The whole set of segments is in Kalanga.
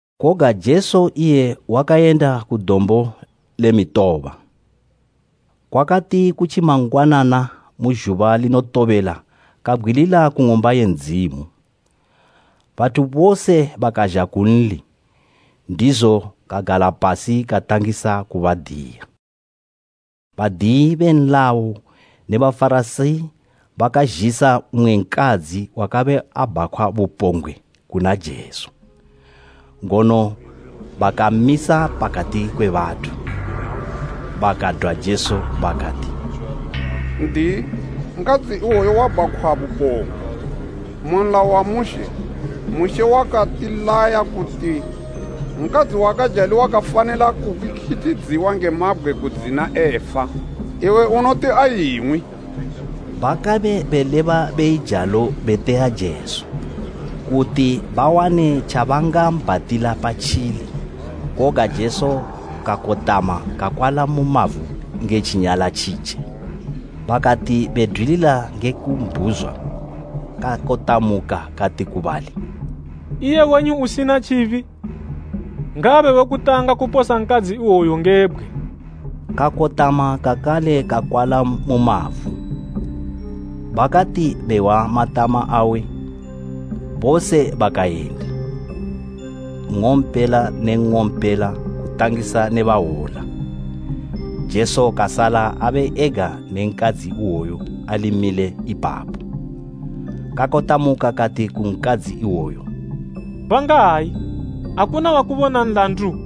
Koga Jesu iye wakayenda ku Dombo le Mitoba. Kwakati kutji mangwanana mu zhuba linotobela kabgwilila ku Ng'umba ye Ndzimu. Bathu bose bakazha kunli, ndizo kagala pasi katangisa kubadiya. Badiyi be nlayo ne Bafarasi bakazhisa mmwe nkadzi wakabe abhakhwa bupombgwe kuna Jesu, ngono bakammisa pakati kwe bathu, bakadwa Jesu bakati, “N'diyi, nkadzi iwoyu wabhakhwa bupombgwe. Mu Nlayo, Mushe wakatilaya kuti nkadzi wakajali wakafanila kukikithidziwa nge mabgwe kudzina efa. Iwe unoti aying'wi?” Bakabe beleba beijalo beteya Jesu, kuti bawane tjabangambhatila patjili. Koga Jesu kakotama kakwala mu mavu nge tjinyala tjitje. Bakati bedwilila nge kumbhuzwa, kakotamuka kati ku bali, “Iye wenyu usina tjibi, ngaabe we kutanga kuposa nkadzi iwoyu nge bgwe.” Kakotama kakale kakwala mu mavu. Bakati behwa matama awe, bose bakayenda, nng'ompela ne nng'ompela, kutangisa ne bahwola. Jesu kasala abe ega ne nkadzi iwoyo ali mile ipapo. Kakotamuka kati ku nkadzi iwoyo, “Bangayi? Akuna wakubona nlandu?”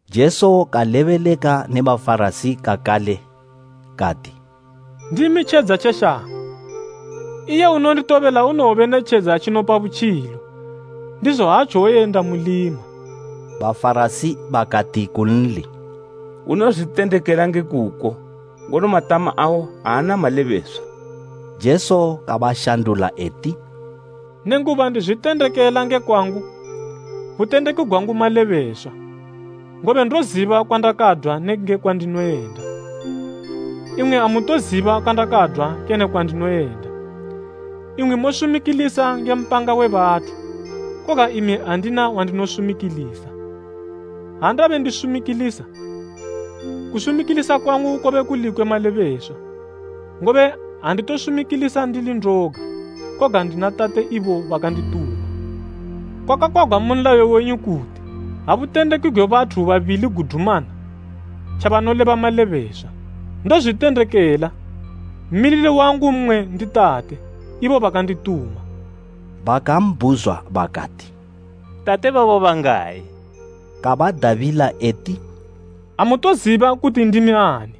Jesu kalebeleka ne Bafarasi kakale kati, “Ndimi tjedza tje shango, iye unonditobela unowobe ne tjedza tjinopa butjilo, ndizo aatjowoyenda mulima.” Bafarasi bakati kunli, “Unozwitendekela nge kuko, ngono matama awo aana malebeswa.” Jesu kabashandula eti, “Nenguba ndizwitendekela nge kwangu, butendeki gwangu malebeswa, ngobe ndoziba kwandakadwa ne nge kwandinoyenda. Imwi amutoziba kwandakadwa kene kwandinoyenda. Imwi mosumikilisa nge mpanga we bathu, koga imi andina wandinosumikilisa. Ha ndabe ndisumikilisa, kusumikilisa kwangu kobe kuli kwe malebeswa, ngobe anditosumikilisa ndili ndoga, koga ndina Tate ibo bakandituma. Kwakakwagwa mu nlayo wenyu kuti, ha butendeki gwe bathu babili gudumana, tjabanoleba malebeswa. Ndozwitendekela, mmilili wangu mmwe ndi Tate, ibo bakandituma.” Bakambhuzwa bakati, “Tate babo bangayi?” Kabadabila eti, “Amutoziba kuti ndimi ani,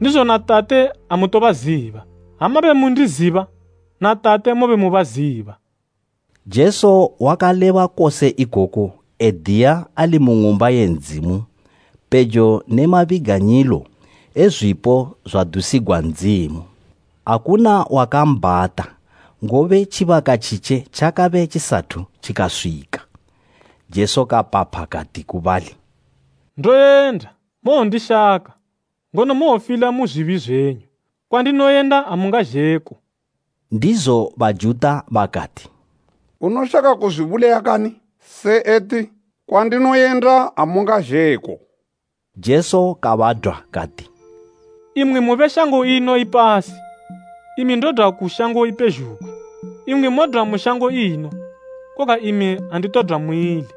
ndizo na Tate amutobaziba. Ha mabe mundiziba, na Tate mobe mubaziba.” Jesu wakaleba kose ikoku ediya ali mu Ng'umba ye Ndzimu pejo ne mabiganyilo e zwipo zwadusigwa Ndzimu. Akuna wakambhata, ngobe tjibaka tjitje tjakabe tjisathu tjikaswika. Jesu kapapha kati ku bali, “Ndoyenda, mowondishaka, ngono mowofila mu zwibi zwenyu. Kwandinoyenda amungazhe ko.” Ndizo Bajuta bakati, “Unoshaka kuzwibulaya kani? Se eti, ‘Kwandinoyenda, amungazhe ko?’” Jesu kabadwa kati, “Imwi mube shango ino ipasi, imi ndodwa ku shango ipezhugwi. Imwi modwa mu shango ino, koga imi anditodwa muili.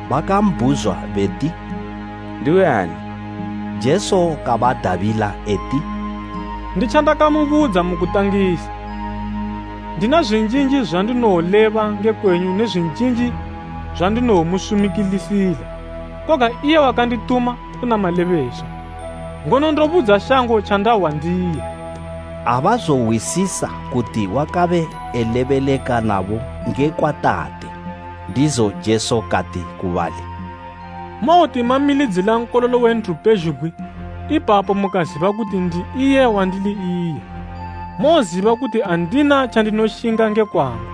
Bakambhuzwa beti, “Ndiwe ani?” Jesu kabadabila eti, “Nditjandakamubudza mukutangisa. Ndina zwinjinji zwandinowoleba nge kwenyu ne zwinjinji zwandinowomusumikilisila. Koga iye wakandituma, una malebeswa, ngono ndobudza shango tjandahwa ndiye.” Abazohwisisa kuti wakabe elebeleka nabo ngekwa Tate. Ndizo Jesu kati ku bali, “Mowoti mamilidzila Nkololo we nthu pezhugwi, ipapo mukaziba kuti ‘Ndi iye wandili iye.’ Mowoziba kuti andina tjandinoshinga nge kwangu,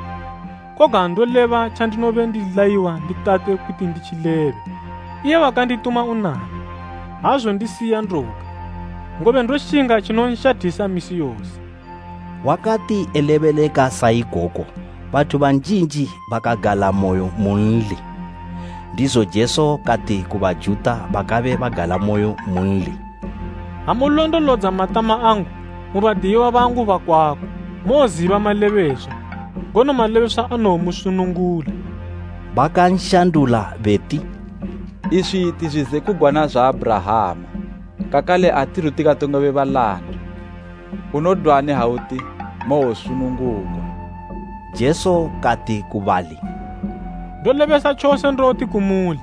koga ndoleba tjandinobe ndilayiwa ndi Tate kuti nditjilebe. Iye wakandituma unami, aazondisiya ndoga, ngobe ndoshinga tjinonshathisa misi yose.” Wakati elebeleka sa ikoko bathu banjinji bakagalamoyo munli. Ndizo Jesu kati ku Bajuta bakabe bagalamoyo munli, “Ha mulondolodza matama angu, mu badiyiwa bangu bakwako, mowoziba malebeswa, ngono malebeswa anowomusunungula.” Bakanshandula beti, “Iswi ti zwizekugwana zwa Abhurahama, kakale atithu tikatongobe balanda. Unodwani ha uti, ‘Mowosunungugwa?’” Jesu kati ku bali, “Ndolebesa tjose ndoti kumuli,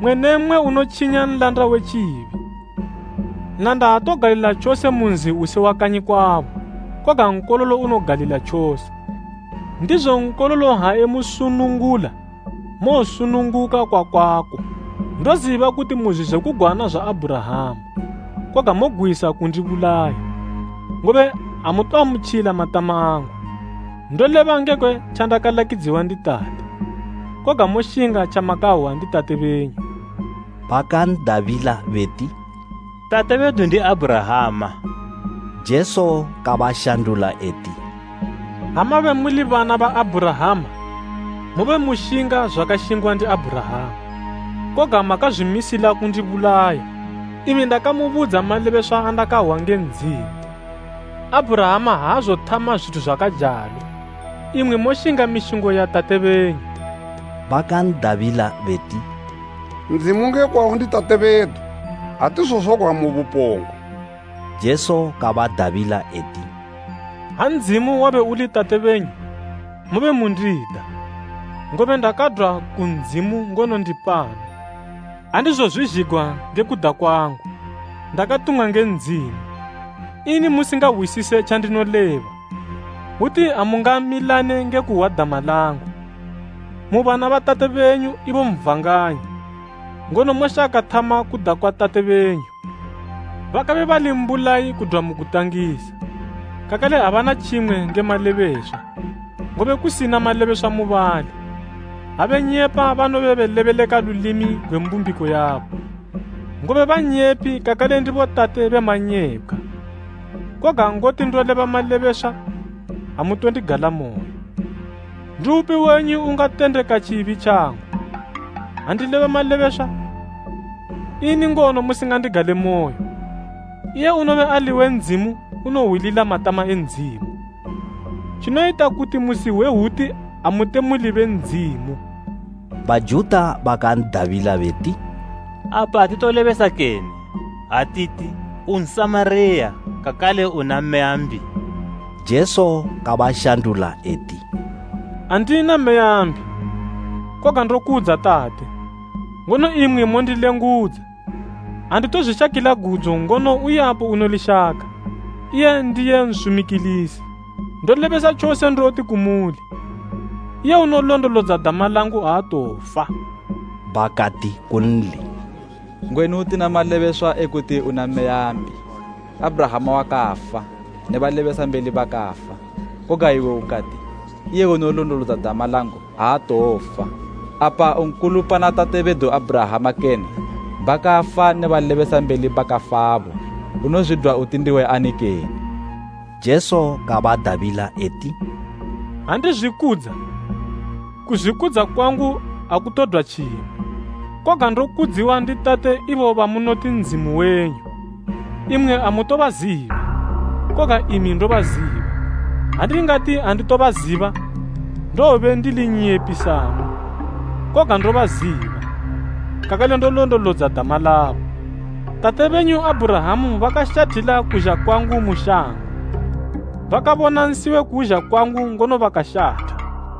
mmwe ne mmwe unotjinya nlanda we tjibi. Nlanda aatogalila tjose mu nzi usi wa kanyi kwabo, koga nkololo unogalila tjose. Ndizo Nkololo ha emusunungula mowosununguka kwakwako. Ndoziba kuti mu zwizekugwana zwa Abhurahama, koga mogwisa kundibulaya, ngobe amutoamutjila matama angu. Ndoleba ngekwe tjandakalakidziwa ndi Tate, koga moshinga tjamakahwa ndi tate benyu.” Bakan'dabila beti, “Tate bedu ndi Abhurahama.” Jesu kabashandula eti, “Ha mabe muli bana ba Abhurahama mobe mushinga zwakashingwa ndi Abhurahama. Koga makazwimisila kundibulaya, imi ndakamubudza malebeswa andakahwa nge Ndzimu. Abhurahama aazothama zwithu zwakajalo! Imwi moshinga mishingo ya tate benyu.” Bakan'dabila beti, “Ndzimu nge kwawo ndi Tate bedu, atizozwagwa mu bupombgwe.” Jesu kabadabila eti, “Ha Ndzimu wabe uli tate benyu, mobe mundida, ngobe ndakadwa ku Ndzimu ngono ndi pano. Andizozwizhigwa nge kuda kwangu, ndakatumwa nge Ndzimu. Ini musingahwisise tjandinoleba? Hwuti amungamilane nge kuhwa dama langu. Mu bana ba tate benyu, ibo Satani, ngono moshaka thama kuda kwa tate benyu. Bakabe bali mbulayi kudwa mu kutangisa, kakale abana tjimwe nge malebeswa, ngobe kusina malebeswa mubali. Ha benyepa banobe belebeleka lulimi gwe mbumbiko yabo, ngobe bannyepi kakale ndibo tate be manyepkhwa. Koga ngoti ndoleba malebeswa, amutondigalamoyo. Ndiupi wenyu ungatendeka tjibi tjangu? Ha ndileba malebeswa, ini ngono musingandigalemoyo? Iye unobe ali we Ndzimu unohwilila matama e Ndzimu. Tjinoyita kuti musihwe hwuti amute muli be Ndzimu.” Bajuta bakan'dabila beti, “Apa atitolebesa kene, ha titi, u Nsamariya kakale una meya mbi?” Jesu kabashandula eti, “Andina meya mbi, koga ndokudza Tate, ngono imwi mondilengudza. Anditozwishakila gudzo ngono uyapo unolishaka, iye ndiye nsumikilisi. Ndolebesa tjose ndoti kumuli, iye unolondolodza dama langu aatowofa.” Bakati kunli, “Ngwenu tina malebeswa ekuti una meya mbi. Abhurahama wakafa ne balebesambeli bakafa, koga iwe ukati, ‘Iye unolondolodza dama langu aatowofa.’ Apa u nkulu pana tate bedu Abhurahama kene? Bakafa ne balebesambeli bakafabo. Unozwidwa uti ndiwe ani kene?” Jesu kabadabila eti, “Ha ndizwikudza, kuzwikudza kwangu akutodwa tjimwe. Koga ndokudziwa ndi Tate ibo bamunoti Ndzimu wenyu. Imwi amutobaziba, koga imi ndobaziba. Ha ndingati anditobaziba, ndowobe ndili nnyepi samwi. Koga ndobaziba, kakale ndolondolodza dama labo. Tate benyu Abhurahama bakashathila kuzha kwangu mu shango, bakabona nsi we kuzha kwangu ngono bakashatha.”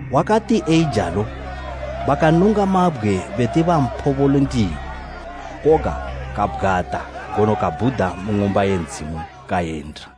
Wakati eijalo, bakanunga mabgwe beti bamphobole ndiwo, koga kabgwata ngono kabhuda mu Ng'umba ye Ndzimu kayenda.